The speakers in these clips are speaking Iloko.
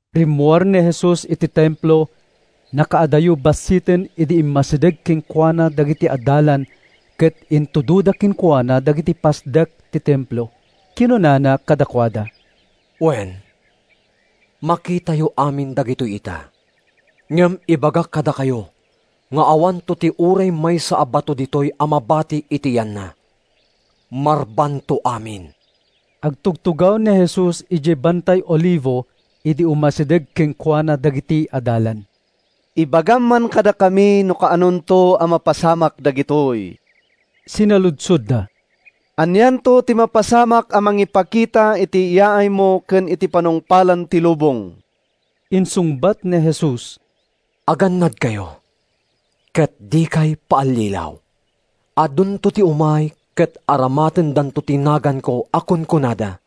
Rimmuar ni Jesus iti Templo. Nakaadayo bassiten idi immasideg kenkuana dagiti adalan ket intudoda kenkuana dagiti pasdek ti Templo. Kinunana kadakuada, “Wen, makitayo amin dagitoy ita. Ngem ibagak kadakayo nga awanto ti uray maysa a bato ditoy a mabati iti yanna. Marbadanto amin.” Agtugtugaw ni Jesus idiay Bantay Olivo idi umasideg kenkuana dagiti adalan. “Ibagam man kadakami no kaanonto a mapasamak dagitoy?” sinaludsodda. “Anianto ti mapasamak a mangipakita iti yaaymo ken iti panungpalan ti lubong?” Insungbat ni Jesus, “Agannadkayo, ket dikayo paallilaw. Adunto ti umay ket aramatendanto ti naganko a kunkunada,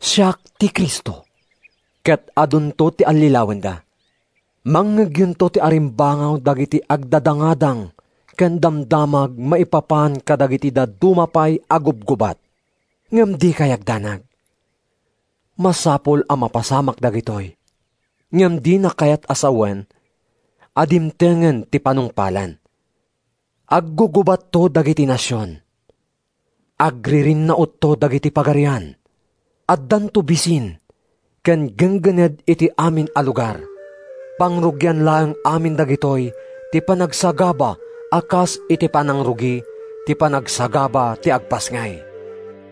‘Siak ti Cristo,’ ket adunto ti allilawenda. Mangngegyonto ti arimbangaw dagiti agdadangadang ken damdamag maipapan kadagiti dadduma pay a gubgubat. Ngem dikay agdanag. Masapul a mapasamak dagitoy ngem dina kayat a sawen a dimtengen ti panungpalan. Aggugubatto dagiti nasion; agririnnautto dagiti pagarian. Addanto bisin ken ginggined iti amin a lugar. Pangrugian laeng amin dagitoy ti panagsagaba a kas iti panangrugi ti panagsagaba ti agpasngay.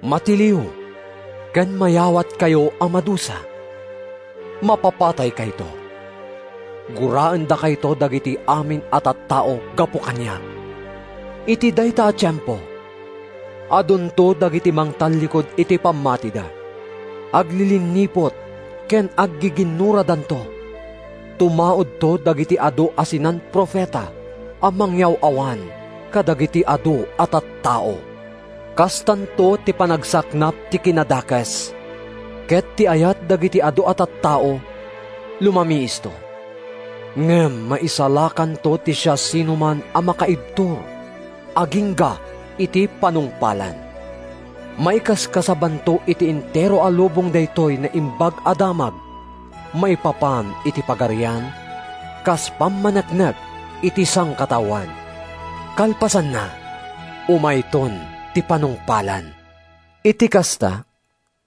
“Matiliw ken mayawatkayto a madusa. Mapapataykayto. Guraendakayto dagiti amin a tattao gapu kaniak. Iti dayta a tiempo, adunto dagiti mangtallikud iti pammatida. Aglilinniput ken aggiginnuradanto. Tumaudto dagiti adu a sinan-profeta a mangyaw-awan kadagiti adu a tattao. Kastanto ti panagsaknap ti kinadakes, ket ti ayat dagiti adu a tattao lumamiisto. Ngem maisalakanto ti siasinoman a makaibtur agingga iti panungpalan. Maikaskasabanto iti entero a lubong daytoy Naimbag a Damag maipapan iti Pagarian kas pammaneknek iti sangkataoan. Kalpasanna, umayton ti panungpalan.” “Iti kasta,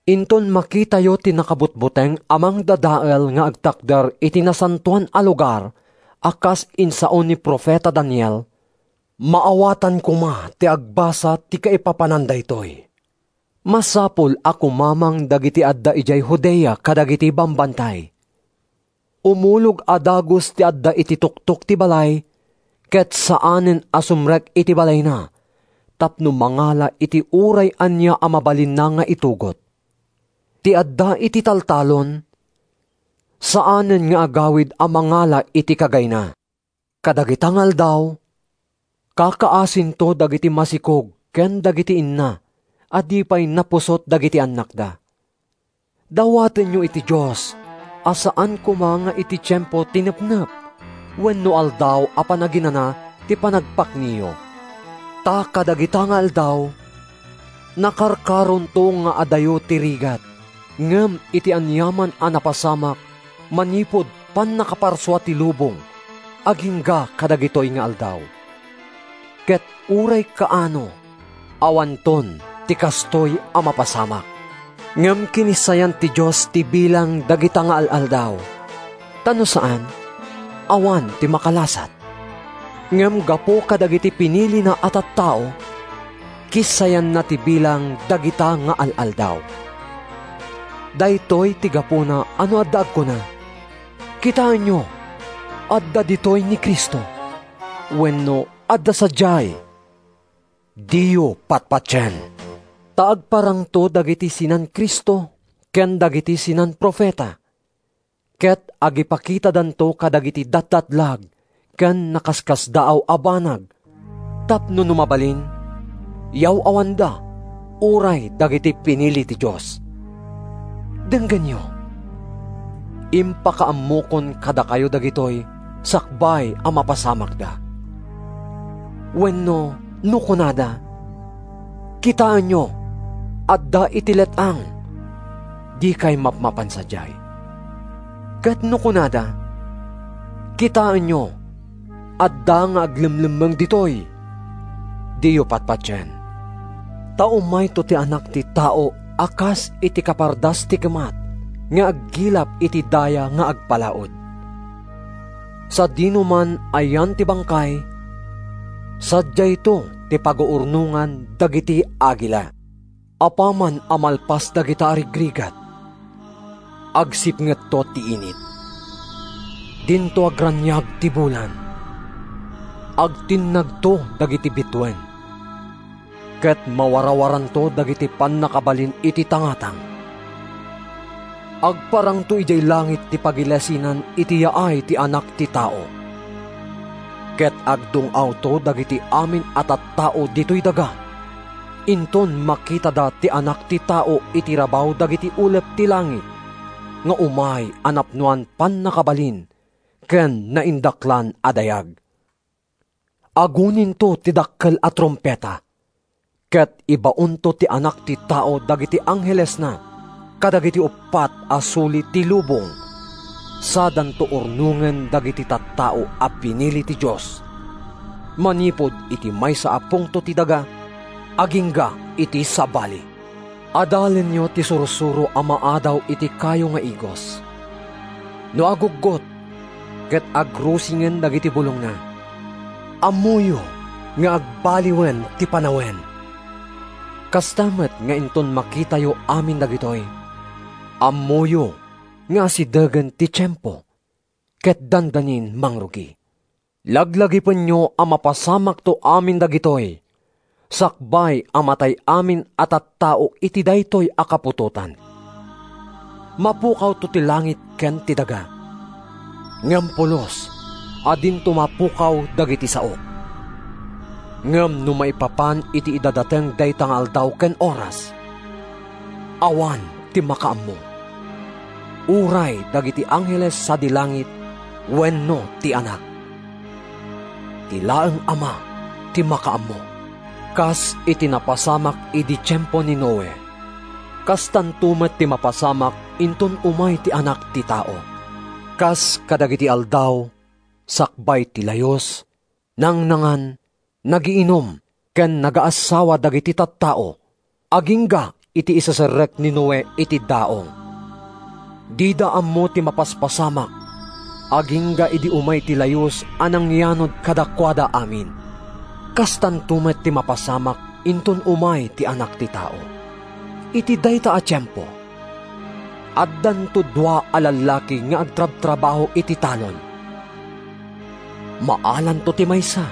inton makitayo ‘Ti Nakabutbuteng a Mangdadael’ nga agtakder iti nasantoan a lugar a kas insao ni profeta Daniel (maawatan koma ti agbasa ti kaipapanan daytoy), masapul a kumamang dagiti adda idiay Judea kadagiti bambantay. Umulog a dagus ti adda iti tuktok ti balay ket saanen a sumrek iti balayna tapno mangala iti uray ania a mabalinna nga itugot. Ti adda iti taltalon saanen nga agawid a mangala iti kagayna. Kadagita nga aldaw, kakaasinto dagiti masikog ken dagiti inna a di pay napusot dagiti annakda. Dawatenyo iti Dios a saan koma nga iti tiempo ti nepnep wenno Aldaw a Panaginana ti panagpakniyo! Ta kadagita nga aldaw, nakarkaronto nga adayo ti rigat ngem iti aniaman a napasamak manipud pannakaparsua ti lubong agingga kadagitoy nga aldaw. Ket uray kaano awanton ti kastoy a mapasamak. Ngem kinissayan ti Dios ti bilang dagita nga al-aldaw, ta no saan, awan ti makalasat. Ngem gapu kadagiti pinilina a tattao, kissayanna ti bilang dagita nga al-aldaw. “Daytoy ti gapuna a no adda agkuna, ‘Kitaenyo, adda ditoy ti Cristo!’ wenno ‘Adda sadiay!’ diyo patpatien. Ta agparangto dagiti sinan-Cristo ken dagiti sinan-profeta, ket agipakitadanto kadagiti datdatlag ken nakaskasdaaw a banag tapno, no mabalin, yaw-awanda uray dagiti pinili ti Dios. Denggenyo, impakaammokon kadakayo dagitoy sakbay a mapasamakda. “Wenno, no kunada, ‘Kitaenyo, adda iti let-ang!’ dikay mapmapan sadiay. Ket no kunada, ‘Kitaenyo, adda nga aglemlemmeng ditoy!’ diyo patpatien. Ta umayto ti Anak ti Tao a kas iti kapardas ti kimat nga aggilap iti daya nga agpa-laud. “Sadinoman a yan ti bangkay, sadiayto ti paguurnongan dagiti agila.” “Apaman a malpas dagita a rigrigat, agsipngetto ti init, dinto agraniag ti bulan, agtinnagto dagiti bituen, ket mawarawaranto dagiti pannakabalin iti tangatang. Agparangto idiay langit ti pagilasinan iti yaay ti Anak ti Tao. Ket agdung-awto dagiti amin a tattao ditoy daga inton makitada ti Anak ti Tao iti rabaw dagiti ulep ti langit nga umay a napnoan pannakabalin ken naindaklan a dayag. Aguninto ti dakkel a trumpeta, ket ibaonto ti Anak ti Tao dagiti anghelesna kadagiti uppat a suli ti lubong sadanto urnongen dagiti tattao a pinili ti Dios, manipud iti maysa a pungto ti daga agingga iti sabali.” “Adalenyo ti sursuro a maadaw iti kayo nga igos: no aguggot ket agrusingen dagiti bulongna, ammoyo nga agbaliwen ti panawen. Kasta met nga inton makitayo amin dagitoy, ammoyo nga asidegen ti tiempo ket dandanin mangrugi. Laglagipenyo a mapasamakto amin dagitoy sakbay a matay amin a tattao iti daytoy a kaputotan. Mapukawto ti langit ken ti daga, ngem pulos a dinto mapukaw dagiti saok.” “Ngem no maipapan iti idadateng dayta nga aldaw ken oras, awan ti makaammo—uray dagiti angheles sadi langit wenno ti Anak. Ti laeng Ama ti makaammo. Kas iti napasamak idi tiempo ni Noe, kastanto met ti mapasamak inton umay ti Anak ti Tao. Kas kadagidi aldaw sakbay ti Layus, nangnangan, nagiinum ken nagaassawa dagiti tattao, agingga iti iseserrek ni Noe iti daong. Dida ammo ti mapaspasamak agingga idi umay ti Layus a nangyanud kadakuada amin. Kastanto met ti mapasamak inton umay ti Anak ti Tao. Iti dayta a tiempo, addanto dua a lallaki nga agtartrabaho iti talon: maalanto ti maysa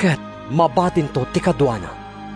ket mabatinto ti kaduana.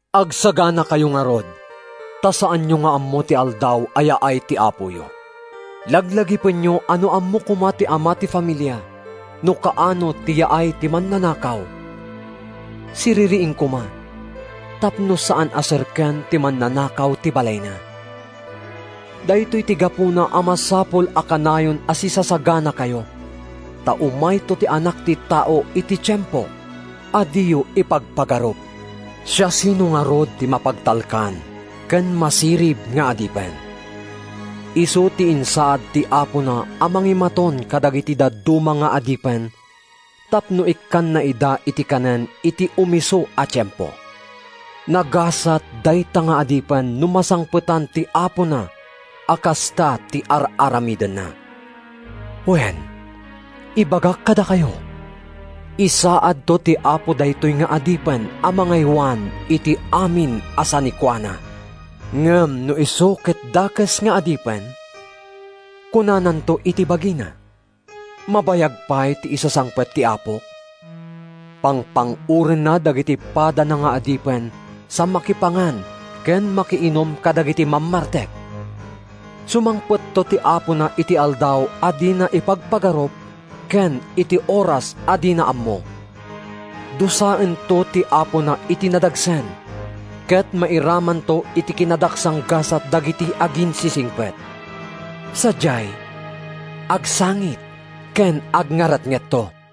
Agsaganakayo ngarud ta saanyo nga ammo ti aldaw a yaay ti Apoyo. Laglagipenyo a no ammo koma ti ama ti familia no kaano ti yaay ti mannanakaw, siririing koma tapno saan a serken ti mannanakaw ti balayna. Daytoy ti gapuna a masapul a kanayon a sisasaganakayo, ta umayto ti Anak ti Tao iti tiempo a diyo ipagpagarup.” “Siasino ngarud ti mapagtalkan ken masirib nga adipen? Isu ti insaad ti apona a mangimaton kadagiti dadduma nga adipen tapno ikkanna ida iti kanen iti umisu a tiempo. Nagasat dayta nga adipen no masangpetan ti apona a kasta ti ar-aramidenna. Wen, ibagak kadakayo, isaadto ti apo daytoy nga adipen a mangaywan iti amin a sanikuana. Ngem no isu ket dakes nga adipen, kunananto iti bagina: ‘Mabayag pay ti isasangpet ti apok.’ Pangpang-orenna dagiti padana nga adipen sa makipangan ken makiinum kadagiti mammartek. Sumangpetto ti apona iti aldaw a dina ipagpagarup ken iti oras a dina ammo. Dusaento ti apona iti nadagsen ket mairamanto iti kinadaksanggasat dagiti aginsisingpet. Sadiay, agsangit ken agngaretngetto.”